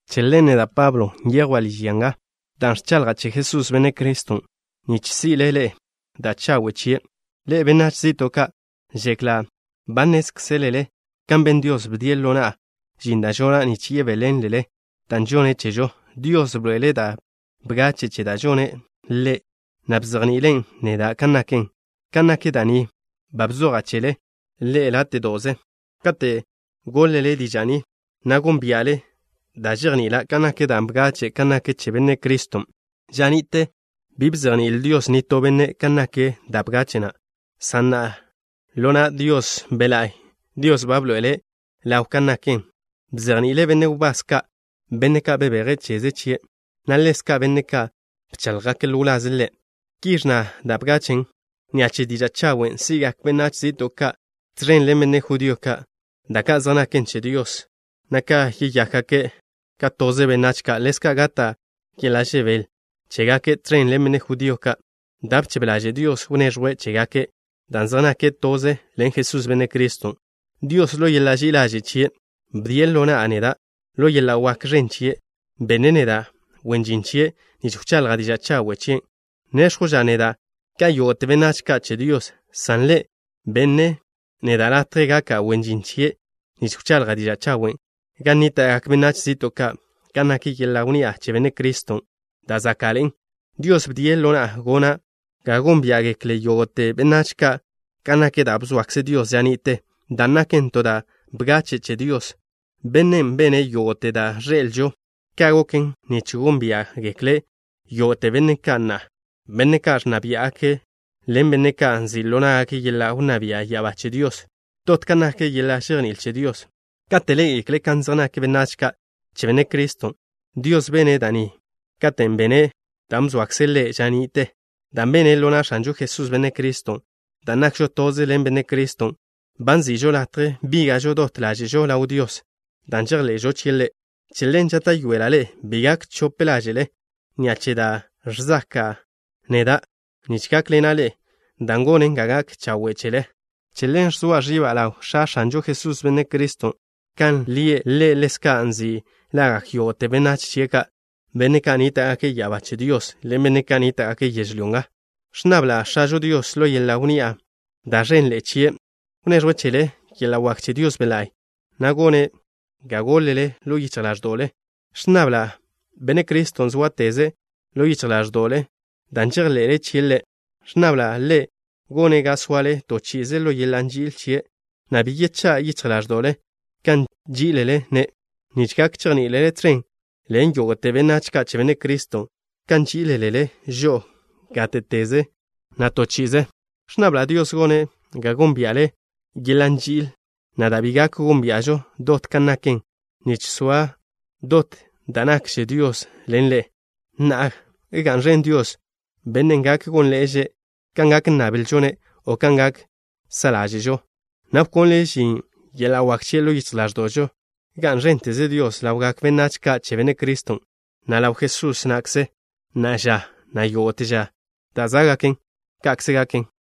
Che ḻen, neda', Pablo, nyejwa' liž ya nga dan' ẕchaḻja' che Jesús, Benne' Criston', nich si'le ḻe'e da' chawe' chie', ḻe'e, benách zi'to' ka'. Žekla' ba nnézkzelele kan ben Dios, bdie' ḻo na'a žin da' žona' nich yebéḻenlele da' žonne' chežo. Dios bḻoe'ele' da' bgache' che da' žone' Ḻe', na' bzejni'ile' neda' kan naken. Kan nak da' ni ba bzoja' chele ḻe'e láte'do'ze. Kate' goḻ-le diža' ni, na' gónbia'le da' žejni'ila' kan nak da' bgache' kan nak che Benne' Criston'. Ža ni'te bi bzejní'il Dios nitó benne' kan nak da' bgache' na', san na'a, ḻo na' Dios Be' La'y, Dios ba bḻoe'ele' ḻaw kan naken. Bzejni'ile' benne' wbás ka', benne' ka' bebeje' cheze chie', na' ḻezka' benne' ka' bcháḻjgake' ḻo wlaze' Ḻe'. Ki ẕnna da' bgachen': “Ni'a che diža' chawen' si'gak benách zi'to' ka' tẕen ḻen benne' judío ka', da' ka' zej naken che Dios, na' yeyákgake' ka toze benách, na' ḻezka' gata' yeḻa' žebél chégake' tẕen ḻen benne' judío ka', da' bchebe ḻaže' Dios wneẕjwe' chégake' dan' zej nake' toze ḻen Jesús, Benne' Criston'.” Dios, ḻo yeḻa' ži'i ḻaže' chie', bdien' ḻo na'a neda'. Ḻo yeḻa' wak ẕen chie', bene' neda' wen žin chie' nich wchaḻja' diža' chawe' chien'. Néx̱jwža' neda' ka yógo'te benách ka' che Dios, san Ḻe' benne' neda' latje gaka' wen žin chie' nich wchaḻja' diža' chawen' gan nníta'gak benách zi'to' ka' kan nak yeḻa' wnni'a che Benne' Criston', da' záka'ḻe'en. Dios bdie' ḻo na'a gona' ga gónbia'gekle yógo'te benách ka' kan nak da' bzoakze Dios ža ni'te, dan' naken to da' bgache' che Dios, Bennen' bene' yógo'te da' ẕḻe'elžo. Ka' goken nich gónbia'gekle yógo'te benne' ka' na'a, benne' ka' ẕnna biá'gake' ḻen benne' ka' nzi' ḻo ná'gake' yeḻa' wnná bia' ya'abá che Dios, dot kan nak yeḻa' žejní'il che Dios, kate' ḻé'egekle' kan zej nak benách ka' che Benne' Criston'. Dios bene' da' ni katen' bene' dan' bzoakze' Ḻe' ža ni'te, dan' bene' ḻo na' X̱anžo Jesús, Benne' Criston'. Dan' nakžo toze ḻen Benne' Criston', ba nzi'žo latje bíga'žo dot ḻáže'žo ḻaw Dios, dan' žejḻe'žo chie' Ḻe'. Che ḻen žáta'yoela' ḻe'e bi gak chope ḻáže'le ni'a che da' ẕzaka'a neda' nich gákḻena' ḻe'e, dan' gonen ga gak chawe' chele. Che ḻen ẕzoa ẕiba' ḻaw X̱a X̱anžo Jesús, Benne' Criston'. Kan lie' Ḻe' ḻezka' nzi' lagak yógo'te benách chie' ka', benne' ka' nníta'gake' ya'abá che Dios ḻen benne' ka' nníta'gake' yežlyó nga. Ẕnnabla' X̱ažo Dios, ḻo yeḻa' wnni'a da' ẕenḻe'e chie', wneẕjwe' chele yeḻa' wak che Dios Be' La'y, na' gone' ga gólele ḻo yichj ḻáẕdo'le. Ẕnnabla' Benne' Criston' sóateze' ḻo yichj ḻáẕdo'le dan' žejḻe'le chie' Ḻe'. Ẕnnabla' Ḻe' gone' ga soale to chi'ize ḻo yeḻa' nži'il chie', na' bi yechá' yichj ḻáẕdo'le kan nží'ilele-ne', nich gak chejní'ilele tẕen ḻen yógo'te benách ka' che Benne' Criston' kan nží'iḻe'ele' žo'o gáte'teze na' to chi'ize. Ẕnnabla' Dios gone' ga gónbia'le yeḻa' nži'il na', da' bi gak gónbia'žo dot kan naken, nich soa dot da' nakkze Dios ḻen ḻe'e. Na'a, ¡ga'n ẕen Dios, Bennen' gak gónḻe'eže' kan gak nnablžo-ne' o kan gak sa' ḻáže'žo, na' wkonle' žin yeḻa' wak chie' ḻo yichj ḻáẕdo'žo! ¡Ga'n ẕénteze Dios ḻawgak benách ka' che Benne' Criston', na' ḻaw Jesús na'kze, na'a ža, na' yógo'te ža da' zá'gaken! Ka'kze gaken.